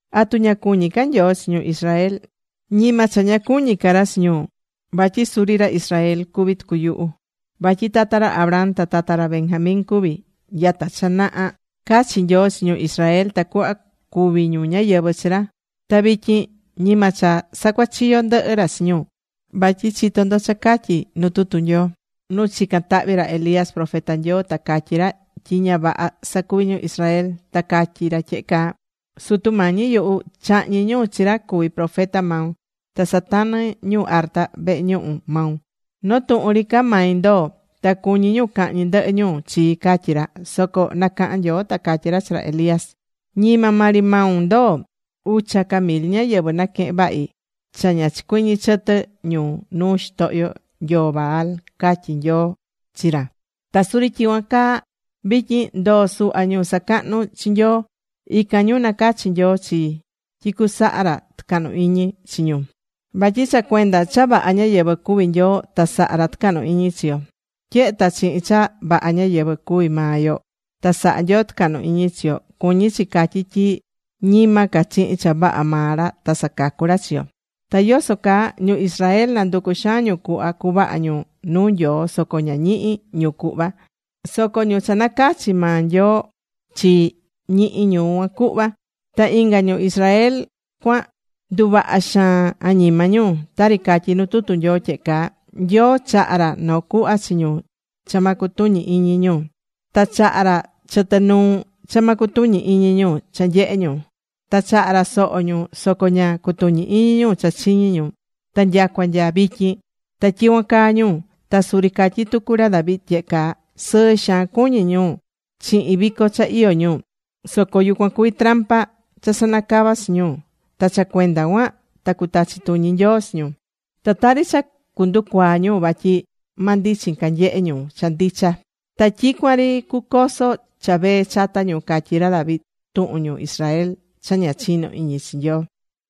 ¿Atu ña cuñí ca Nyoo chi ñu Israel? Ñima cha ña cuñí ca ra chi ñu, vatyi suri ra Israel cuví tucu yuhu. Vatyi tata ra Abraham ta tata ra Benjamín cuví. Nyata cha naha cachi̱ Nyoo chi ñu Israel tacuhva cuvi ñu ñáyɨvɨ chi ra. Ta vityin ñima cha sacuachiyó ndɨhɨ ra chi ñu, vatyi chitó ndo cha catyí nu tutu Nyoo nu chicán tahvi ra Elías, profeta Nyoo, ta catyí ra tyi ña vaha sacuví ñu Israel, ta catyí ra tyehe caa: “Sutu Mañi yuhu, chahñi̱ ñu chi ra cuví profeta maun, ta satanɨ̱ ñu arta vehe ñuhu maun. Noo tuhun ri ca mai ndoo, ta cuñí ñu cahñi ndɨhɨ ñu chii”, catyí ra. Soco nacaha̱n Nyoo ta catyí ra chi ra Elías: “Ñima maa ri maun ndoo. Ucha ca mil ñáyɨvɨ naquehe̱n vahi cha ña chicuɨñɨ̱ chɨtɨ ñu nuu xitohyo nyoo Baal”, catyí Nyoo chi ra. Ta suri tyicuan caa vityin, ndoo suhva ñu sacahnú chi Nyoo. Ican ñu nacachi̱ Nyoo chii tyi cusaha ra tucahnu iñi chi ñu. Vatyi cha cuenda cha vaha ñáyɨvɨ cuví Nyoo ta sahá ra tɨcahnu iñi chi yo. Tyehe ta chihin cha vaha ñáyɨvɨ cuví maa yo ta sahá Nyoo tucahnu iñi chi yo, cuñí chi catyi tyi ñima ca chihin cha vaha maa ra ta sacacú ra chi yo. Ta ¿yoso caa? Ñu Israel nanducu̱ xaan ñu cuhva cuvaha ñu nuu Nyoo soco ña ñihi̱ ñu cuhva. Soco ñu cha nacachi̱ maa Nyoo chii, ñihi̱ ñu cuan cuhva. Ta inga ñu Israel cuan ndundava̱ xaan añima ñu. Tari catyí nu tutu Nyoo tyehe caa: “Nyoo chaha̱ ra noo cuhva chi ñu cha ma cutuñi iñi ñu. Ta chaha̱ ra chɨtɨ nuu cha ña cutuñí iñi ñu cha nyehe ñu. Ta chaha̱ ra soho ñu soco ña cutuñí iñi ñu cha chiñi̱ ñu, ta nyacua nya vityin ta tyicuan caa ñu.” Ta suri catyi̱ tucu ra David tyehe caa: Sɨɨ xaan cuñí ñu chihin vico cha iyó ñu, soco yucuan cuví trampa cha sanacava̱ chi ñu. Ta cha cuenda cuan ta cutachi tuñi Nyoo chi ñu. Ta tari cha cunducuaa ñu vatyi ma ndichin ca nyehe ñu cha ndicha. Ta tyicuan ri cucoso cha vee chata ñu, catyí ra David tuhun ñu Israel cha ña chinó iñi chi Nyoo.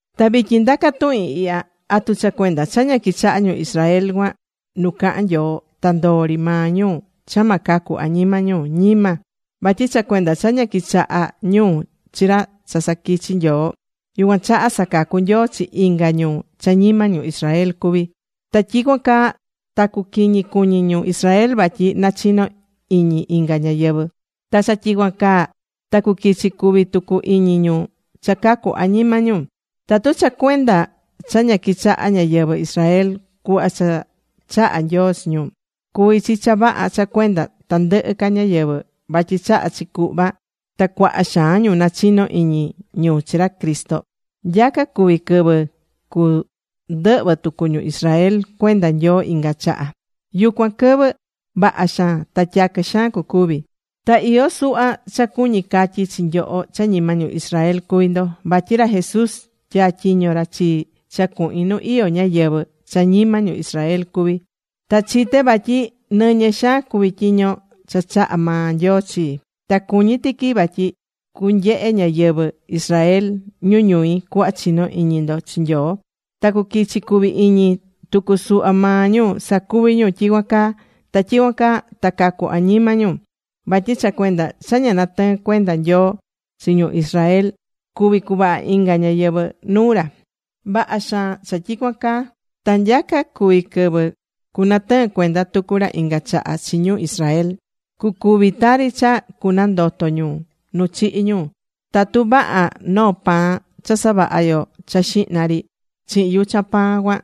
Ta vityin ndaca tuhin ihya: ¿Atu cha cuenda cha ña quichaha̱ ñu Israel cuan nu cahán Nyoo, ta ndoó ri maa ñu cha ma cacu ca añima ñu? Ñima. Vatyi cha cuenda cha ña quichaha̱ ñu chi ra cha saquichi̱ Nyoo, yucuan chaha sacacu̱ Nyoo chi inga ñu cha ñima ñu Israel cuví. Ta tyicuan caa ta cuquiñi cuñí ñu Israel vatyi nachino iñi inga ñáyɨvɨ. Ta cha tyicuan caa ta cuquichi cuvi tucu iñi ñu cha cacu añima ñu. Tatu cha cuenda cha ña quichaha̱ ñáyɨvɨ Israel cuhva cha chaha̱ Nyoo chi ñu, cuví chi cha vaha cha cuenda tandɨhɨ ca ñáyɨvɨ, vatyi chahá chi cuhva, ta cuaha xaan ñu nachino iñi ñu chi ra Cristo, nyaca cuví quɨvɨ cundɨhvɨ tucu ñu Israel cuenda Nyoo inga chaha. Yucuan quɨvɨ, vaha xaan ta tyaquɨ xaan cucuvi. Ta iyó suhva cha cuñí catyi chi nyoho cha ñima ñu Israel cuví ndo, vatyi ra Jesús tyatyiño̱ ra chii cha cuhin nu iyó ñáyɨvɨ cha ñima ñu Israel cuví. Ta chité vatyi nɨñɨ xaan cuví tyiño cha chaha̱ maa Nyoo chii. Ta cuñí tiqui vatyi cunyehe ñáyɨvɨ Israel ñu ñui cuhva chinó iñi ndo chi Nyoo, ta cuquichi cuvi iñi tucu suhva maa ñu sacuvi ñu tyicuan caa. Ta tyicuan caa ta cacu añima ñu. Vatyi cha cuenda cha ña natɨɨ̱n cuenda Nyoo chi ñu Israel cuví cuvaha inga ñáyɨvɨ nuu ra. Vaha xaan cha tyicuan caa ta nyaca cuvi quɨvɨ cunatɨɨn cuenda tucu ra inga chaha chi ñu Israel, cucuvi tari cha cunandoto ñu nu chihi̱ ñu. Tatu vaha noo pan cha savaha̱ yo cha xihna ri chihin yuchan pan cuan,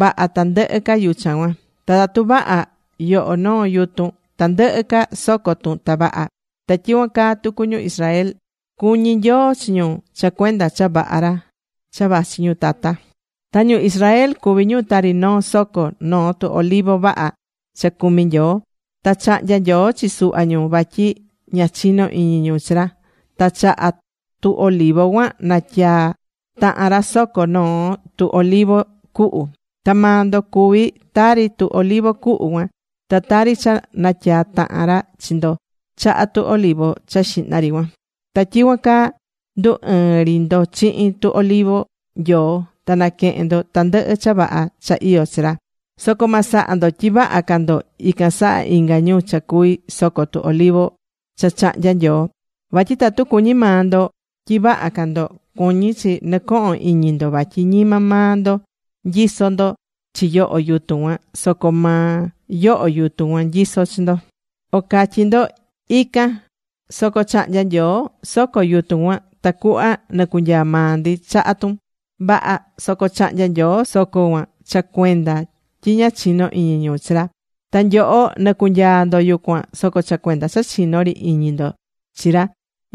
vaha tandɨhɨ ca yuchan cuan. Ta tatu vaha yoho noo yutun, tandɨhɨ ca soco tun, ta vaha. Ta tyicuan caa tucu ñu Israel, cuñí Nyoo chi ñu cha cuenda cha vaha ra cha vachi ñu tata. Ta ñu Israel cuvi̱ ñu tari noo soco noo tu olivo vaha cha cumí Nyoo. Ta chahnya̱ Nyoo chi suhva ñu vatyi ña chino̱ iñi ñu chi ra. Ta chaha tu olivo cuan natyaa̱ tahan ra soco noo tu olivo cuhu. Ta maa ndo cuví tari tu olivo cuhu cuan. Ta tari cha natyaa̱ tahan ra chi ndo chaha tu olivo cha xihna ri cuan. Ta tyicuan caa ndu̱ ɨɨn ri ndo chihin tu olivo Nyoo ta naquehén ndo tandɨhɨ cha vaha cha iyó chi ra. Soco ma saha ndo tyi vaha ca ndo ican saha inga ñu cha cuví soco tu olivo cha chahnya̱ Nyoo. Vatyi tatu cuñí maa ndo tyi vaha ca ndo, cuñí chi nɨcohon iñi ndo vatyi ñima maa ndo nyisó ndo chi yoho yutun cuan, soco maa yoho yutun cuan nyisó chi ndo. O catyí ndo: “Ican, soco chahnya̱ Nyoo soco yutun cuan tacuhva nicunyaa maa ndi chaha tun.” Vaha. Soco chahnya̱ Nyoo soco cuan cha cuenda tyi ña chino̱ iñi ñu chi ra. Ta nyoho nicunyaa ndo yucuan, soco cha cuenda cha chinó ri iñi ndo chi ra.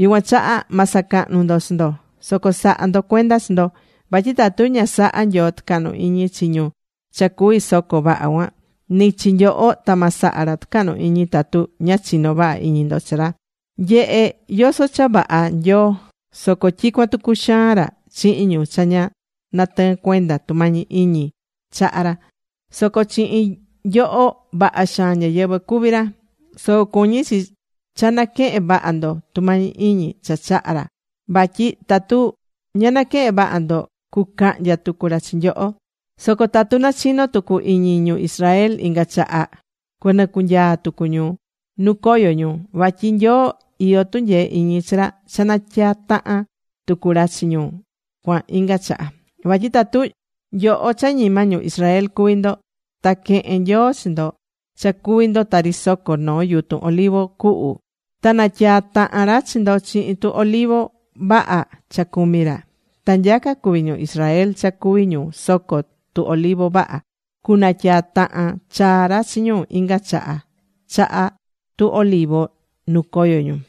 Yucuan chaha ma sacahnu ndo chi ndo, soco sa̱ha ndo cuenda chi ndo. Vatyi tatu ña saha̱ Nyoo tɨcahnu iñi chi ñu cha cuví soco vaha cuan, ni chi nyoho ta ma saha ra tɨcahnu iñi tatu ña chinó vaha iñi ndo chi ra. Nye̱he yoso cha vaha Nyoo, soco tyicuan tucu xaan ra chihin ñu cha ña natɨɨ́n cuenda tumañi iñi chahá ra. Soco chihin nyoho, vaha xaan ñáyɨvɨ cuví ra. Soco cuñí chi cha naquehén vaha ndo tumañi iñi cha chahá ra vatyi tatu ña naquehén vaha ndo, cucahnya tucu ra chi nyoho. Soco tatu nachino tucu iñi ñu Israel inga chaha, cu nɨcunyaa tucu ñu nu coyo̱ ñu. Vatyi Nyoo iyó tunyee iñi chi ra cha natyatahan tucu ra chi ñu cuan inga chaha. Vatyi tatu nyoho cha ñima ñu Israel cuví ndo, ta quehe̱n Nyoo chi ndo cha cuví ndo tari soco noo yutun olivo cuhu, ta natyaa̱ tahan ra chi ndo chihin tu olivo vaha cha cumí ra, ¡ta nyaca cuví ñu Israel cha cuví ñu soco tu olivo vaha! ¡Cunatyaa tahan chaa ra chi ñu inga chaha chaha tu olivo nu coyo̱ ñu!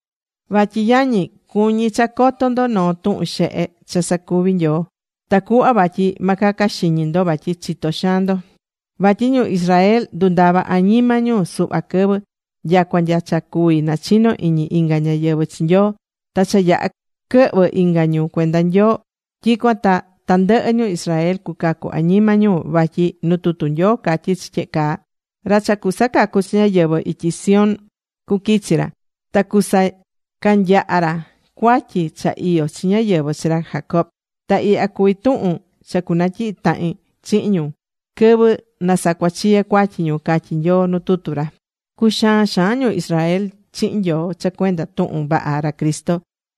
Vatyi yañi, cuñí cha coto ndo noo tuhun xehe cha sacuví Nyoo, tacuhva vatyi ma caca xiñi ndo vatyi chitó xaan ndo. Vatyi ñu Israel ndundava̱ añima ñu suhva quɨvɨ, nyacua nya cha cuví nachino iñi inga ñáyɨvɨ chi Nyoo. Ta cha yaha̱ quɨhvɨ inga ñu cuenda Nyoo, tyicuan ta tandɨhɨ ñu Israel cucacu añima ñu, vatyi nu tutu Nyoo catyí chi tyehe caa: Ra cha cusacacu chi ñáyɨvɨ, ityi Sión cuquichi ra. Ta cusacanyaha ra cuatyi cha iyó chi ñáyɨvɨ chi ra Jacob. Ta ihya cuví tuhun cha cunatyihi tahin chihin ñu, quɨvɨ na sacuachiye cuatyi ñu, catyí Nyoo nu tutu ra. Cuxaán xaan ñu Israel chihin Nyoo cha cuenda tuhun vaha ra Cristo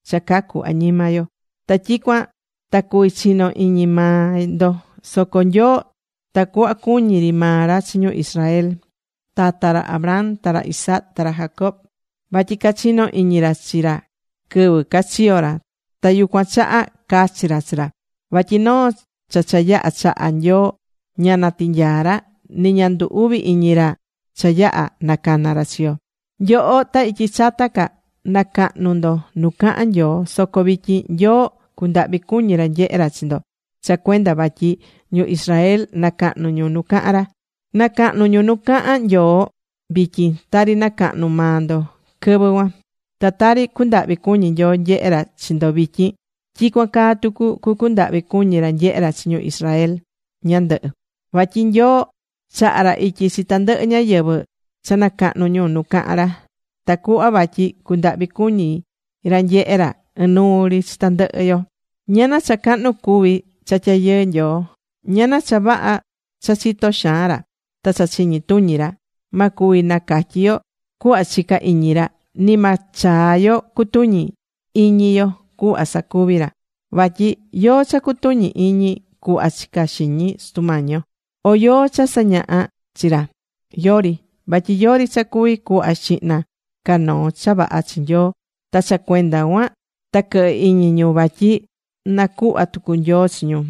cha cacu añima yo. Ta tyicuan ta cuví chino iñi maa ndo. Soco Nyoo tacuhva cuñí ri maa ra chi ñu Israel tata ra Abraham, ta ra Isaac, ta ra Jacob vatyi cachino̱ iñi ra chi ra quɨvɨ cachiyo̱ ra, ta yucuan chaha cachi̱ ra chi ra. Vatyi noo cha cha yaha̱ chaha Nyoo ña natinyaá ra. Ni ña ndu uvi iñi ra cha yaha nacana ra chi yo. Nyoho, ta ityi chata ca, nacahnu̱ ndo nu cahán Nyoo. Soco vityin, Nyoo cundahvi cuñí ra nyehé ra chi ndo cha cuenda vatyi ñu Israel nacahnú ñu nu cahán ra. Nacahnú ñu nu cahán Nyoo vityin tari nacahnu̱ maa ndo quɨvɨ cuan. Ta tari cundahví cuñí Nyoo nyehé ra chi ndo vityin, tyicuan caa tucu cucundahvi cuñi ra nyehe ra chi ñu Israel ñandɨhɨ. Vatyi Nyoo chaha̱ ra ityi chi tandɨhɨ ñáyɨvɨ cha nacahnú ñu nu cahán ra, tacuhva vatyi cundahvi cuñi ra nyehé ra ɨnuu ri chi tandɨhɨ yo. ¡Ñana cha cahnu cuví cha tyayɨɨ Nyoo! ¡Ñana cha vaha cha chitó xaan ra, ta cha chiñi tuñi ra! Ma cuvi nacatyi yo cuhva chicá iñi ra, ni ma chaa yo cutuñi iñi yo cuhva sacuví ra. Vatyi ¿yóó cha cutuñi̱ iñi cuhva chicá xiñi Sutu Mañi yo? ¿O yóó cha sañahá chi ra? Yori. Vatyi yori cha cuví cuhva xihna ca noo cha vaha chi Nyoo ta cha cuenda cuan ta quɨhɨ iñi ñu vatyi na cuhva tucu Nyoo chi ñu.